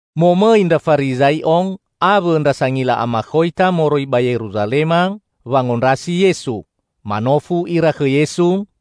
Momõi ndra Farizai'o awõ ndra Sangila Amakhoita moroi ba Yeruzalema wangondrasi Yesu. Manofu ira khõ Yesu,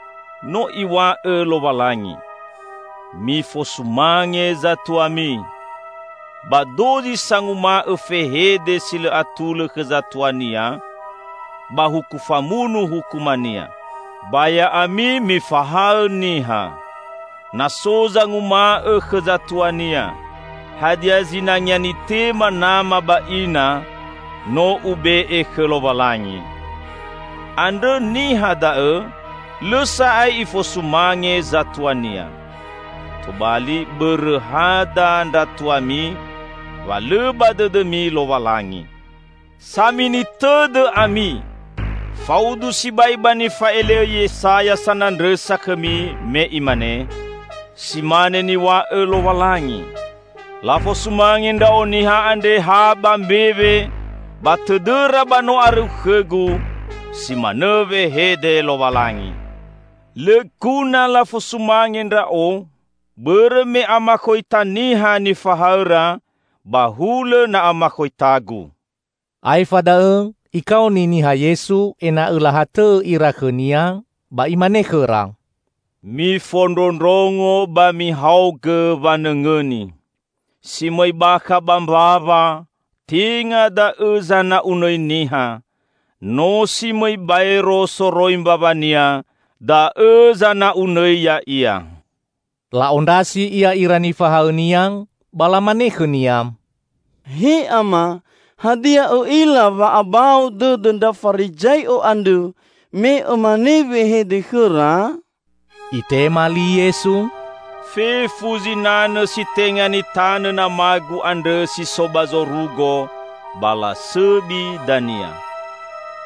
No Iw̃a'õ Lowalangi, 'Mifosumange zatuami,' ba 'Dozi sanguma'õ fehede si lõ atulõ khõ zatuania, ba huku famunu hukumania.' Ba ya'ami mifahaõ niha: na so zanguma'õ khõ zatuania, 'Hadia zinangea nitema nama ba ina, no ube'e khõ Lowalangi,' andrõ niha da'õ lõ sa'ae ifosumange zatuania. Tobali bõrõ hada ndra tuami, wa lõ ba dõdõmi Lowalangi. Samini tõdõ ami! Faudu sibai ba nifa'ele'õ Yesaya sanandrõsa khõmi, me imane, 'Si mane niw̃a'õ Lowalangi: Lafosumange Ndra'o niha andre ha ba mbewe, ba tõdõra ba no arõu khõ-Gu, si manõ wehede Lowalangi. Lõ guna lafosumange Ndra'o, bõrõ me amakhoita niha nifahaõra, ba hulõ na amakhoita-Gu!'" Aefa da'õ Ikaoni niha Yesu ena'õ lahatõ'õ ira khõ-Nia, ba Imane khõra, "Mifondrondrongo ba mihaogõ wanõngõni! Si mõi bakha ba mbawa tenga da'õ zana'unõi niha; no si mõi baero soroi mbawania, da'õ zana'unõi ya'ia." La'ondrasi Ia ira nifahaõ-Nia ba lamane khõ-Nia, "He Ama, hadia Õ'ila wa abao dõdõ ndra Farizai'o andrõ me Õmanõ wehede khõra?" Itema li Yesu, "Fefu zinanõ si tenga nitanõ nama-Gu andrõ si so ba zorugo, ba lasõbi dania.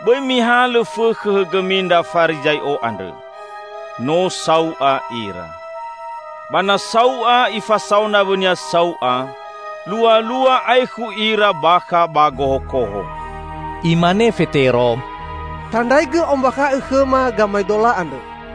Bõi mihalõ fõkhõ hõgõmi ndra Farizai'o andrõ. No sau'a ira. Ba na sau'a ifasao nawõnia sau'a, lualua aekhu ira bakha ba gohokoho." Imane Fetero, "Tandraigõ ombakha'õ khõma gamaedola andrõ!"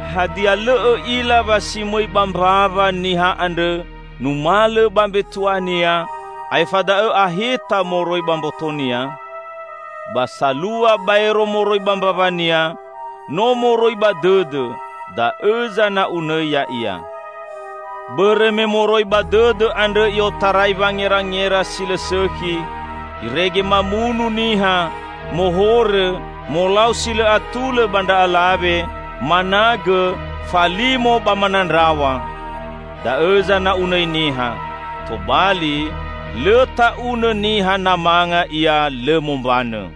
Hadia, lõ õ'ila wa si mõi ba mbawa niha andrõ numalõ ba mbetu'ania, aefa da'õ aheta moroi ba mbotonia? Ba salua baero moroi ba mbawania, no moroi ba dõdõ; da'õ zana'unõi ya'ia. Bõrõ me moroi ba dõdõ andrõ i'otarai wangerangera si lõ sõkhi, irege mamunu niha, mohorõ, molau si lõ atulõ ba ndra alawe, managõ, falimo ba manandraw̃a. Da'õ zana'unõi niha. Tobali, lõ ta'unõ niha na manga ia lõ mombanõ!"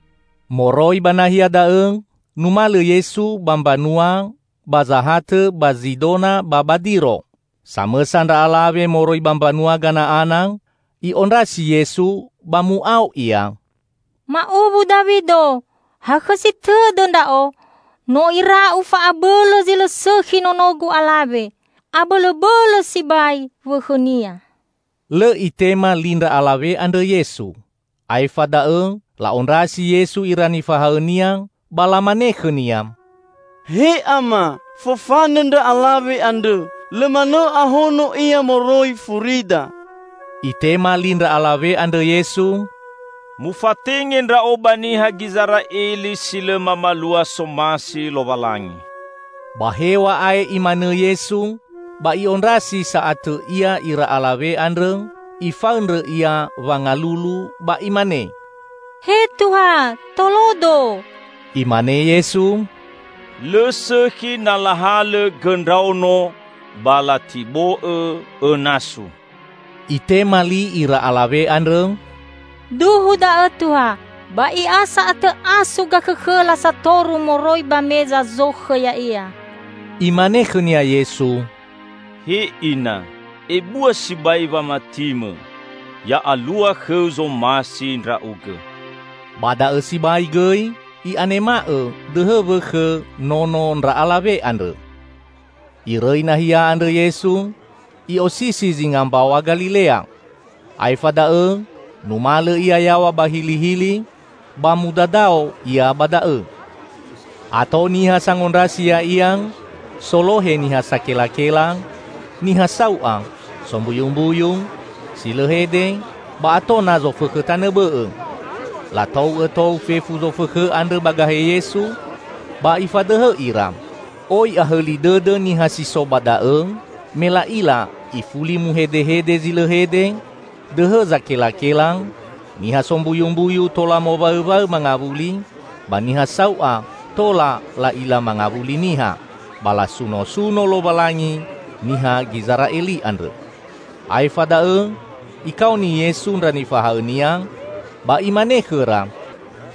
Moroi ba nahia da'õ numalõ Yesu ba mbanua ba zahatõ ba Zidona ba ba Diro. Samõsa ndra alawe moroi ba mbanua Gana'ana, i'ondrasi Yesu ba mu'ao ia, "Ma'uwu Dawido, hakhõsi tõdõ ndra'o! No ira'u fa'abõlõ zi lõ sõkhi nonogu alawe. Abõlõbõlõ sibai wõkhõnia." Lõ Itema li ndra alawe andrõ Yesu. Aefa da'õ la'ondrasi Yesu ira nifahaõ-Nia ba lamane khõ-Nia, "He Ama, fofanõ ndra alawe andrõ. Lõ manõ ahono ia moroi furida!" Itema li ndra alawe andrõ Yesu, "Mufatenge Ndra'o ba niha Gizera'eli si lõ mamalua somasi Lowalangi." Ba hew̃a'ae Imanõ Yesu, ba i'ondrasi sa'atõ Ia ira alawe andrõ, ifaõndrõ ia wangalulu ba imane, "He Tuha, tolodo." Imane Yesu, "Lõ sõkhi na lahalõ gõ ndraono ba latibo'õ õ nasu." Itema li ira alawe andrõ, "Duhu da'õ Tuha, ba i'a sa'atõ asu gakhõkhõla satoru moroi ba meza zokhõ ya'ia." Imane khõnia Yesu, "He Ina, ebua si'ai wamatimõ! Ya'alua khõu zomasi ndra'ugõ!" Ba da'õ sibai gõi i'anema'õ dõhõ wõkhõ nono ndra alawe andrõ. Irõi nahia andrõ Yesu, I'osisi zinga Mbaw̃a Galilea. Aefa da'õ numalõ Ia yaw̃a ba hilihili ba mudadao Ia ba da'õ. Ato niha sangondrasi Ya'ia solohe niha sakelakela, niha sau'a, sombuyumbuyu, si lõ hede, ba ato na zofõkhõ tanõ bõ'õ. Latou'õ tou fefu zofõkhõ andrõ ba gahe Yesu, ba Ifadõhõ ira. Oi ahõli dõdõ niha si so ba da'õ me la'ila ifuli muhedehede zi lõ hede, dõhõ zakelakela, niha sombuyumbuyu tola mowaõwaõ mangawuli ba niha sau'a tola la'ila mangawuli niha. Ba lasunosuno Lowalangi niha Gizera'eli andrõ. Aefa da'õ Ikaoni Yesu ndra nifahaõ-Nia ba Imane khõra,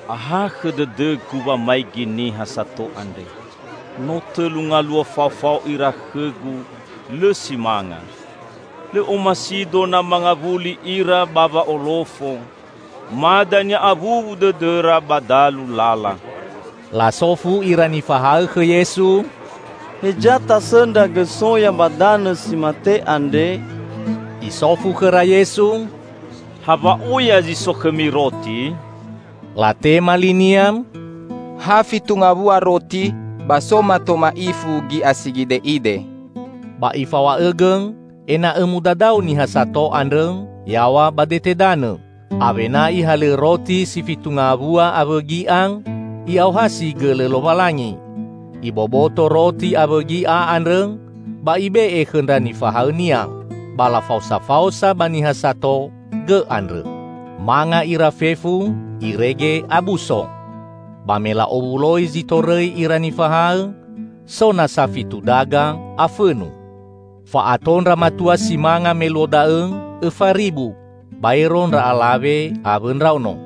"Ahakhõ dõdõ-Gu wamaigi niha sato andre. No tõlu ngaluo faofao ira khõ-Gu, lõ si manga. Lõ omasi-Do na mangawuli ira ba wa'olofo, ma dania awuwu dõdõra ba dalu lala." Lasofu ira nifahaõ khõ Yesu, "Heza tasõndra gõ soya ba danõ si mate andre?" Isofu khõra Yesu, "Hawa'oya zi so khõmi roti?" Latema li-Nia, "Ha fitu ngawua roti ba so mato ma'ifu gi'a si gide'ide." Ba Ifaw̃a'õgõ ena'õ mudadao niha sato andrõ yaw̃a ba dete danõ. Awena Ihalõ roti si fitu ngawua awõ gi'a, I'aohasi gõlõ Lowalangi. Iboboto roti awõ gi'a andrõ, ba Ibe'e khõ ndra nifahaõ-Nia. Ba lafaosafaosa ba niha sato gõ andrõ. Manga ira fefu irege abuso. Ba me la'owuloi zi torõi ira nifahaõ, so nasa fitu daga afõnu. Fa'ato ndra matua si manga me luo da'õ õfa ribu, baero ndra alawe awõ ndraono.